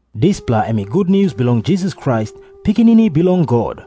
Dispela em i gutnius bilong Jisas Krais, Pikinini Bilong God.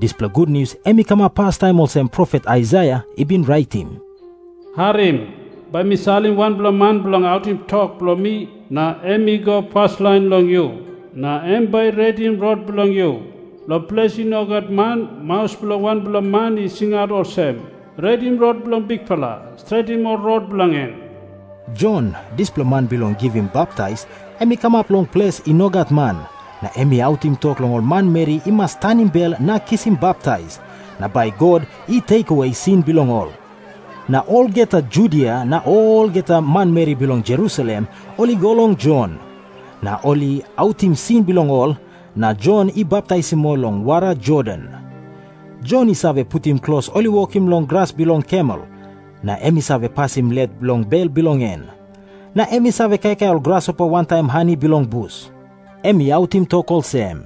Dispela gutnius em i kamap pastaim olsem profet Aisaia i bin raitim, “Harim. Bai mi salim wanpela man bilong autim tok bilong mi, na em i go paslain long yu. Na em bai i redim rot bilong yu. Long ples i no gat man, maus bilong wanpela man i singaut olsem, ‘Redim rot bilong Bikpela. Stretim ol rot bilong en.’” Jon, dispela man bilong givim baptais, em i kamap long ples i no gat man, na em i autim tok long ol manmeri i mas tanim bel na kisim baptais, na bai God i lusim sin bilong ol. Na olgeta Judia na olgeta manmeri bilong Jerusalem ol i go long Jon. Na ol i autim sin bilong ol, na Jon i baptaisim ol long wara Jordan. Jon i save putim klos ol i wokim long gras bilong kamel, na em i save pasim let long bel bilong en. Na em i save kaikai ol grasopa wantaim hani bilong bus. Em i autim tok olsem,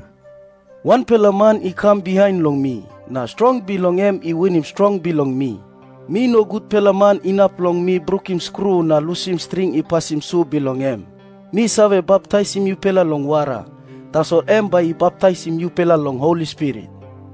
“Wanpela man i kam bihain long mi, na strong bilong en i winim strong bilong mi. Mi no gutpela man inap long mi brukim skru na lusim string i pasim su bilong em. Mi save baptaisim yupela long wara. Tasol em bai i baptaisim yupela long Holi Spirit.”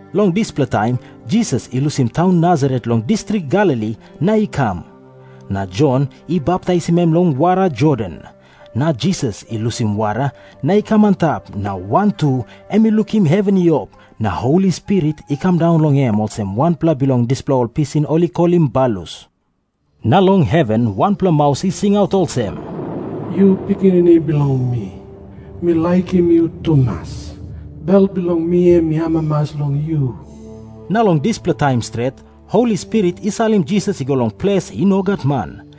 Long dispela taim Jisas i lusim taun Nasaret long distrik Galili na i kam. Na Jon i baptaisim em long wara Jordan. Na Jisas i lusim wara na i kam antap, na wantu em i lukim heven i op, na Holi Spirit i kam daun long em olsem wanpela bilong ol dispela pisin ol i kolim balus. Na long heven wanpela maus i singaut olsem, “Yu Pikinini bilong mi. Mi laikim yu tumas. Bel bilong mi em i amamas long yu.” Na long dispela taim stret Holi Spirit i salim Jisas i go long ples i no gat man.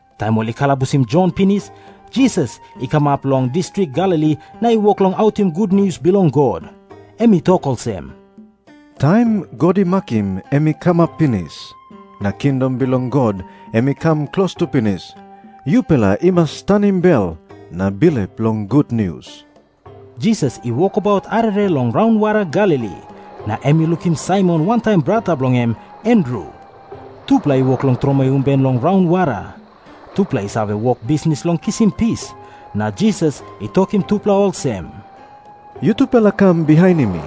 Taim ol i kalabusim Jon pinis, Jisas i kam kamap long distrik Galili na i wok long autim gutnius bilong God. Em i tok olsem, “Taim God i makim em i kamap pinis, na Kingdom bilong God em i kam klostu pinis. Yupela i mas tanim bel na bilip long gutnius.” Jisas i wokabaut arere long raunwara Galili, na em i lukim Saimon wantaim brata bilong en Andru. Tupela i wok long tromoi umben long raunwara. Tupela i save wok bisnis long kisim pis. Na Jisas i tokim tupela olsem, “Yutupela kam bihainim mi,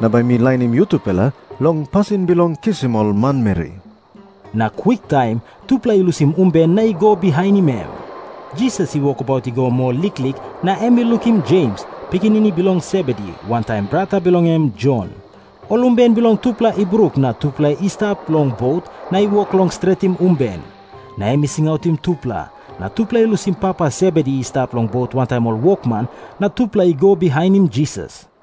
na bai mi lainim yutupela long pasin bilong kisim ol manmeri.” Na kwiktaim tupela i lusim umben na i go bihainim em. Jisas i wokabaut i go moa liklik, na em i lukim Jems, pikinini bilong Sebedi, wantaim brata bilong en Jon. Ol umben bilong tupela i bruk na tupela i stap long bot na i wok long stretim umben. Na em i singautim tupela, na tupela i lusim papa Sebedi i stap long bot wantaim ol wokman, na tupela i go bihainim Jisas.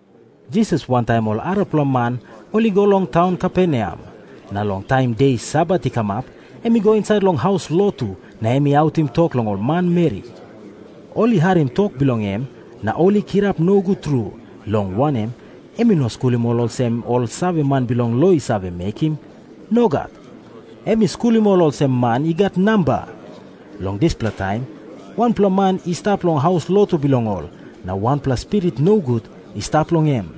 Jisas wantaim ol arapela man ol i go long taun Kaperneam. Na long taim de Sabat i kamap em i go insait long haus lotu na em i autim tok long ol manmeri. Ol i harim tok bilong em, na ol i kirap nogut tru, long wanem, em i no skulim ol olsem ol saveman bilong lo i save mekim. Nogat. Em i skulim ol olsem man i gat namba. Long dispela taim wanpela man i stap long haus lotu bilong ol, na wanpela spirit nogut i stap long em.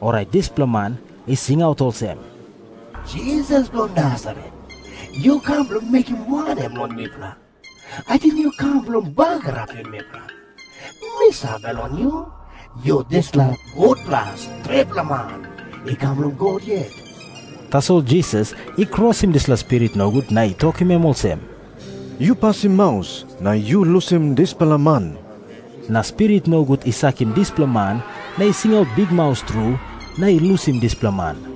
Orait dispela man i singaut olsem, “Jisas bilong Nasaret, yu kam bilong mekim wanem long mipela? Ating yu kam bilong bagarapim mipela? Mi save long yu. Yu dispela gutpela stretpela man i kam long God yet.” Tasol Jisas i krosim dispela spirit nogut na i tokim em olsem, “Yu pasim maus na yu lusim dispela man.” Na spirit nogut i sakim dispela man, na i singaut bikmaus tru, na i lusim dispela man.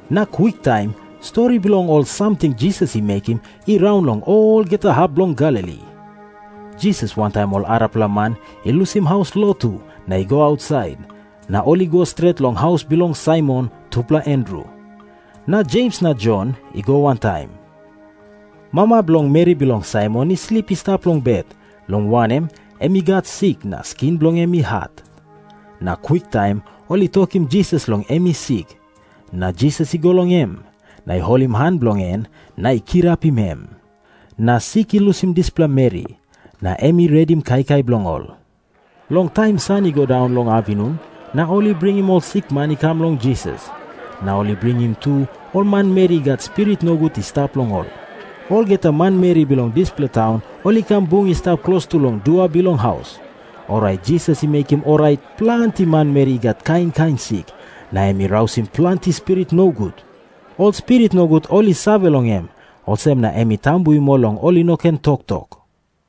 Na kwiktaim stori bilong ol samting Jisas i mekim i raun long olgeta hap bilong Galili. Jisas wantaim ol arapela man i lusim haus lotu na i go ausait, na ol i go stret long haus bilong Saimon tupela Andru. Na Jems na Jon i go wantaim. Mama bilong meri bilong Saimon i slip i stap long bet, long wanem, em i gat sik na skin bilong en i hat. Na kwiktaim ol i tokim Jisas long em i sik. Na Jisas i go long em, na i holim han bilong en na i kirapim em. Na sik i lusim dispela meri, na em i redim kaikai bilong ol. Long taim san i go daun long apinun, na ol i bringim ol sikman i kam long Jisas. Na ol i bringim tu ol manmeri i gat spirit nogut i stap long ol. Olgeta manmeri bilong dispela taun ol i kam bung i stap klostu long dua bilong haus. Orait Jisas i mekim orait planti manmeri i gat kain kain sik. Na em i rausim planti spirit nogut. Ol spirit nogut ol i save long em, olsem na em i tambuim ol long ol i no ken toktok.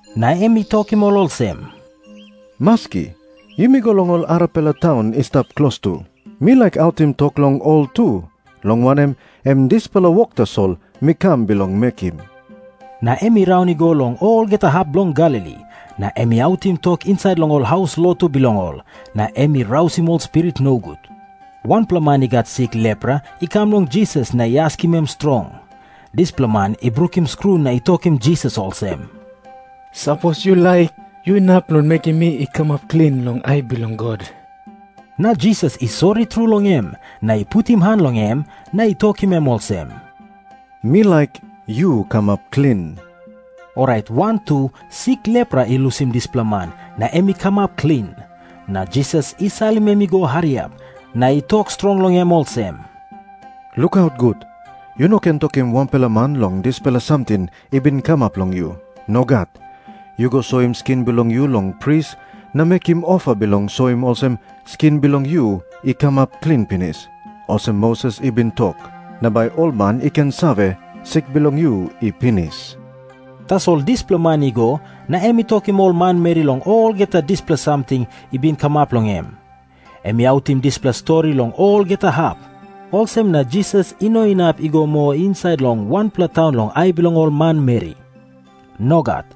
Na em i tokim ol olsem, “Maski, yumi go long ol arapela taun i stap klostu. Mi laik autim tok long ol tu, long wanem, em dispela wok tasol mi kam bilong mekim.” Na em i raun i go long olgeta hap bilong Galili, na em i autim tok insait long ol haus lotu bilong ol, na em i rausim ol spirit nogut. Wanpela man i gat sik lepra i kam long Jisas na i askim em strong. Dispela man i brukim skru na i tokim Jisas olsem, “Sapos yu laik, yu inap long mekim mi i kamap klin long ai bilong God.” Na Jisas i sori tru long em, na i putim han long em, na i tokim em olsem, “Mi laik. Yu kamap klin.” Orait wantu sik lepra i lusim dispela man, na em i kamap klin. Na Jisas i salim em i go hariap, na i tok strong long em olsem, “Lukaut gut. Yu no ken tokim wanpela man long dispela samting i bin kamap long yu. Nogat. Yu go soim skin bilong yu long pris, na mekim ofa bilong soim olsem skin bilong yu i kamap klin pinis, olsem Moses i bin tok. Na bai ol man i ken save, sik bilong yu i pinis.” Tasol dispela man i go, na em i tokim ol manmeri long olgeta dispela samting i bin kamap long em. Em i autim dispela stori long olgeta hap. Olsem na Jisas i no inap i go moa insait long wanpela taun long ai bilong ol manmeri. Nogat.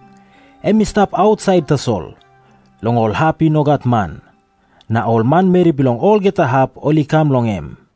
Em i stap ausait tasol, long ol hap i no gat man. Na ol manmeri bilong olgeta hap ol i kam long em.